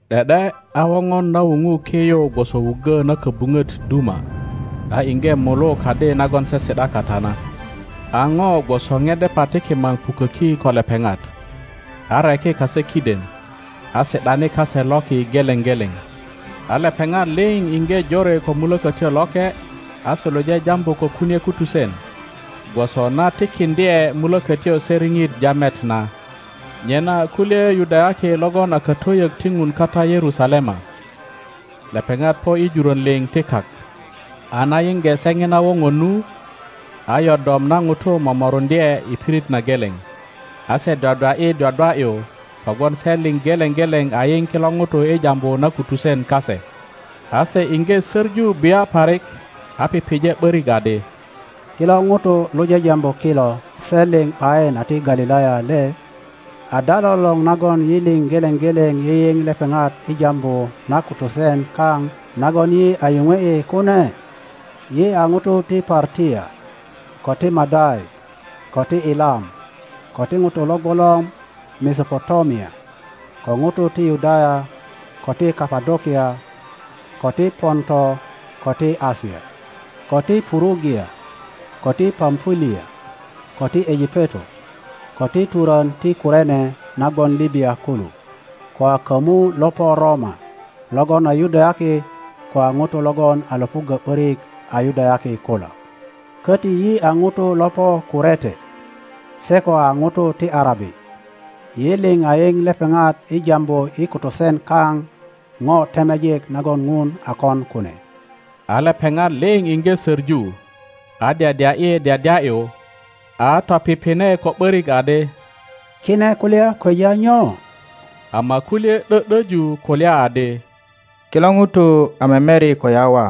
’De ’de a woŋon na wuŋu ki yu gwoso wuggo na kobuŋot duma, a iŋge mulu kadi nagon se si ’da kata na. A ŋo gwoso ŋedepa ti kimaŋ puköki ko lepeŋat, areki kase kiden, a si ’dani kase loki geleŋ geleŋ. A lepeŋat liŋ iŋge jore ko Mulökötyo Loke, a suluje jambu ko kunie kutusen, gwoso na tikiŋdye Mulökötyo se riŋit jamet na. Nyena kulye Yudayaki logon a katwöyök ti Ŋun kata Yerusalema. Lepeŋat po i juron liŋ ti kak. A na yiŋge se ŋina woŋon nu, a yodom na ŋutu momoruŋdye i pirit na geleŋ, a se dwadwa ’yi dwadwa ’yu kogwon se liŋ geleŋ geleŋ a yiŋ kilo ŋutu i jambu na kutusen kase. a se iŋge söŋu bia parik, a pije ’borik adi, Kilo ŋutu lo jajambu kilo se liŋ ’bayin a ti Galilaya le? Ada lolor nagon yi liŋ geleŋ geleŋ yiyiŋ lepeŋat i jambu na kutusen kao nagon yi a yuŋwe ’i kune? Yi a ŋutu ti Partia, ko ti Madai, ko ti Elam, ko ŋutu lo gwolor Mesopotamia, ko ŋutu ti Yudaya, ko ti Kapodokia, ko ti Ponto, ko ti Asia, ko ti Purugia, ko ti Pampulia, ko ti Ejipeto, ko ti turön ti Kurene na gwon Libya kulu, ko a komu lo po Roma, logon a Yudayaki ko a ŋutu logon a Iöpuggo ’börik a Yudayaki kulo, köti yi a ŋutu lo po Kurete se ko a ŋutu ti Arabi. Yi liŋ a yiŋ lepeŋat i jambu i kutusen kaŋ ŋo temejik nagon Ŋun a kon kune. a lepeŋat liŋ iŋge söŋu, a dyadya ’yi dyadya ’yu, a topiŋine ko ’börik adi, Kine kulya kweja nyo? Ama kulye ’dö ’döju kulya adi, Kilo ŋutu a memeri ko yawa.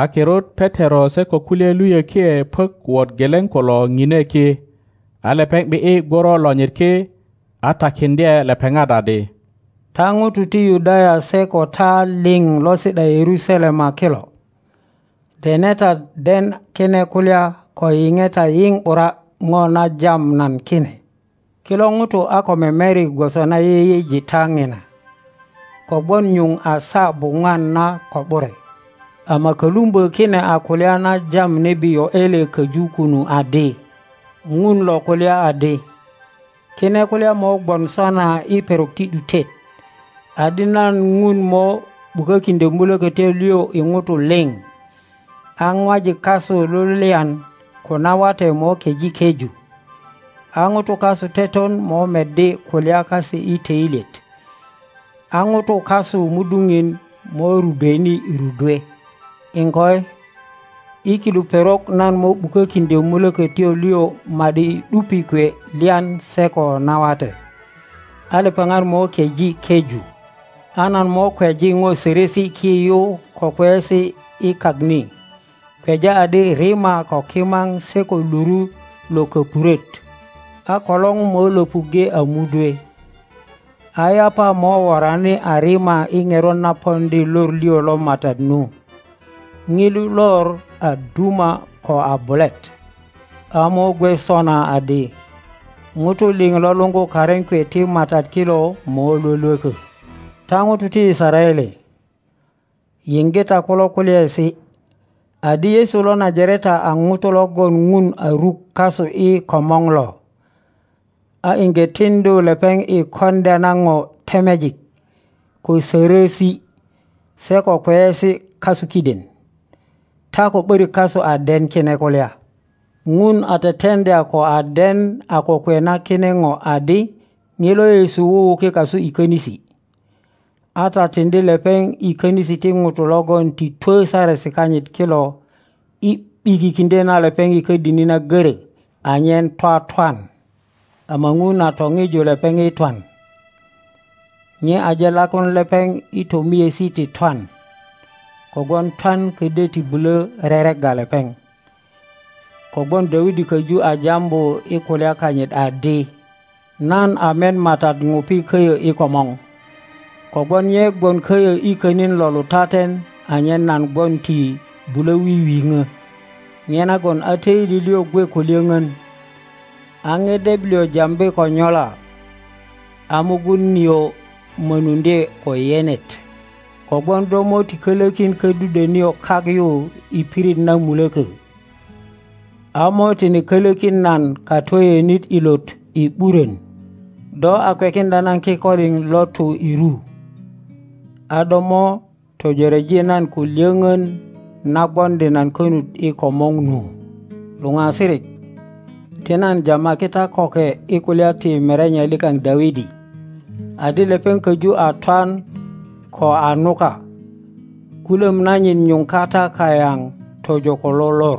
A kirut Petero se ko kulye luyökie puök wot geleŋ kulo ŋine ki, a lepeŋ ’bi ’yi gworo lonyit ki, a takiŋdye lepepat adi, Ta ŋutu ti Yudaya se ko ta liŋ lo si ’da Yerusalema kilo, dene ta den kine kulya ko yiŋe ta yiŋ ’bura ŋo na jam nan kine. Kilo ŋutu a ko memeri gwoso na yeyeji ta ŋina, kogwon nyuŋ a saa buŋwan na ko ’bure; ama kölumbö kine a kulya na jam nebi Yoele köŋ kunu adi, Ŋun lo kulya adi, Kine kulya mo gwon sona i perok ti ’dutet, adi nan Ŋun mo ’bukökiŋdyö Mulökötyo lio i ŋutu liŋ, a ŋwajik kasu lulyan ko nawate mo keŋ keju, a ŋutu kasu teton mo meddi kulya kase i töilyet, a ŋutu kasu muduŋin mo rudweni rudwe; iŋkoi, i kilu perok nan mo ’bukökiŋdyö Mulökötyo lio ma ’di i ’dupi kwe lyan se ko nawate; a lepeŋat mo keŋ keju. A nan mo kweji ŋo sörösi ki yu ko kweyesi i kak ni, kweja adi rima ko kimaŋ se ko luru lo köpuröt. A kolor mo Iöpuŋge a mudwe, a yapa mo worani a rima i ŋerot na poŋdi lor lio lo MATAT nu, ŋilu lor a duma ko a bulet. A mo gwe sona adi, ŋutu liŋ lo luŋgu karin kwe ti MATAT kilo mo lwölwökö. Ta ŋutu ti Yisaraele, yiŋge ta kulo kulyaesi, adi Yesu lo Najareta a ŋuto logon Ŋun a ruk kasu i komor lo, a iŋge tiŋdu lepeŋ i koŋdya na ŋo temejik, ko sörösi, se ko kweyesi kasu kiden. Ta ko ’börik kasu a den kine kulya. Ŋun a tetendya ko a den a kokwe na kine ŋo adi ŋilo Yesu wuwuki kasu i konisi, a ta tindi lepeŋ i konisi ti ŋutu logon ti two saresi kanyit kilo i ’bikikindyo na lepeŋ i kodini na goro anyen twatwan. Ama Ŋun a toŋiju lepeŋ i twan; nye aje lakuŋ lepeŋ i tömiesi ti twan, kogwon twan ködyo ti bulo reregga lepeŋ. Kogwon Dawidi köju a jambu i kulya kanyit adi, Nan a met Matat ŋupi köyö i komor, kogwon nye gwon köyö könin lo lutatenanyen nan gwon ti bulo wiwiŋö. Nyenagon a töili lio gwe ko lyöŋön, a ŋedep lio jambi ko nyola;a mugun nio mönundye ko yenet. Kogwon do mo ti kölökin ködudwö nio kak yu i pirit na mulökö, a mo tine kölökin nan katwöyönit ilot i ’burön. Do a kwekindya nan kikolin lo tu i ru, a do mo töjoreji nan ko lyöŋön na gwondi nan konut i komor nu. Lupasirik, ti nan jamaki ta köke i kulya ti merenye likaŋ Dawidi; adi lepeŋ köju a twan ko a nuka. Gulöm nanyit nyuŋ kata kayaŋ tojo ko lo lor.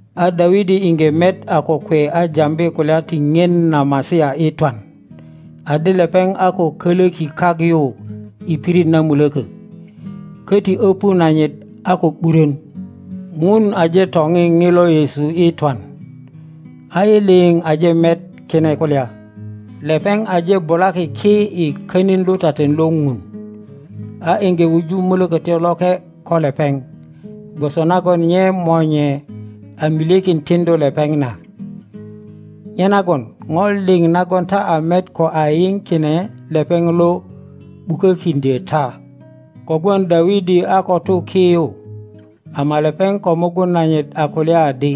a Dawidi iŋge met a kokwe a jambi kulya ti boŋon na Masia i twan, adi lepeŋ a ko koloki kak yu i pirit na muloko, koti opu nanyit a ko ’burön. ŋun aje toŋi ŋilo Yesu i twan, a yi lio aje met kine kulya. Lepeŋ aje bulaki ki i könin lutaten lo Dun, a iŋge wuju Mulokotyo Loke ko lepeŋ, gwoso nagon nye Monye a milyekin tindu lepeŋ na. Nyenagon ŋo liŋ nagon ta a met ko a yio kine lepeŋ lo ’bukökindyo ta. Kogwon Dawidi a ko tu ki yu, ama lepeŋ ko mugun nanyit a kulya adi,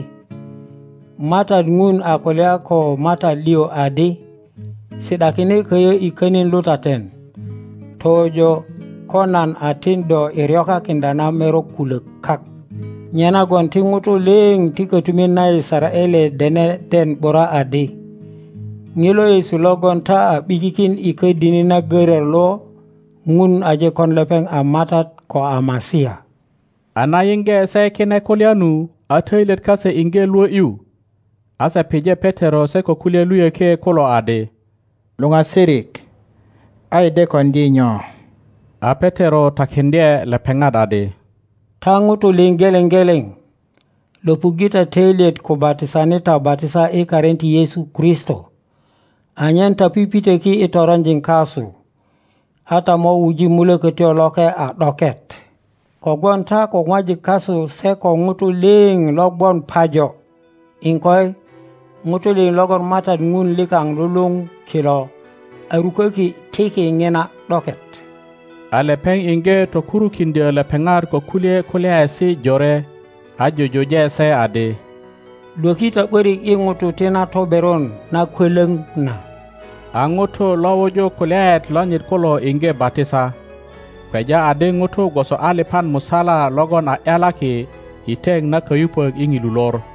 Matat Ŋun a kulya ko Matat lio adi, Si ’dakine koyo i könin lutaten, tojo ko nan a tin do i ryokakindya na merok kulok kak. Nyenagon ti ŋutu lio ti kotumit na Yisaraele dene den ’bura adi, ŋilo Yesu logon ta a ’bikikin i kodini na görö lo ŋun aje kon lepeŋ a Matat ko a Masia. A na yiŋge se kine kulya nu, a töilyet kase iŋge lwö ’yu, a se pije Petero se ko kulye luyökie kulo adi, Luoasirik, a yi de kondi nyo? a Petero takindye lepepat adi, Ta ŋutu liŋ geleŋ geleŋ, lopuŋge ta töilyet ko batisani ta batisa i karin ti Yesu Kristo, anyen ta pipitoki i toronjin kasu, a ta mo wuji Mulbkbtyo Loke a ’doket. Kogwon ta ko ŋwajik kasu se ko ŋutu lio lo gwon pajo, iŋkoi, ŋutu lio logon Matat Ŋun likaŋ luluŋ kilo a rukoki tiki ŋina ’doket. A lepeŋ iŋgo tokurukindyo lepepat ko kulye kulyaesi jore, a jujuje se adi, lwök ta ’borik i ŋutu ti na toberon nakwolor na. a ŋutu lo wuju kulyaet lonyit kulo iŋge batisa, kweja adi ŋutu gwoso alipan musala logon a ’yalaki i teŋ na kayupok i ŋilu lor.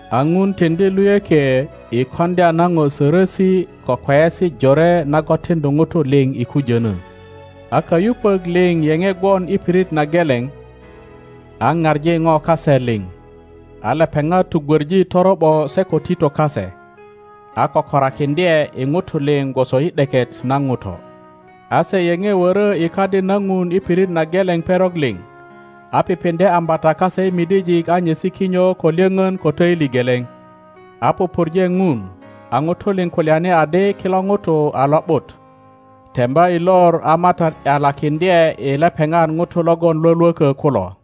a Ŋun tindi luyökie i kondya na po sorosi ko kweyesi jore nagon tindu ŋutu liŋ i kujono. a kayupok liŋ yepe gwon i pirit na geleŋ, a paŋi po kase liŋ; a lepeŋat tugwoŋi toro ’bo se ko tito kase, a kökorakindye i ŋutu liŋ gwoso i ’deket na ŋuto. a se yepe woro i Kadi na Ŋun i pirit na geleŋ perok liŋ, a pipindye ambata kase i midijik a nyesi kinyo ko lyoŋon ko töili geleŋ, a pupurje Ŋun, a ŋutu lip kulyani adi kilo ŋutu a lo ’but. Temba i lor a Matat ’yalakindye i lepeŋat ŋutu logon Iwolwoko kulo.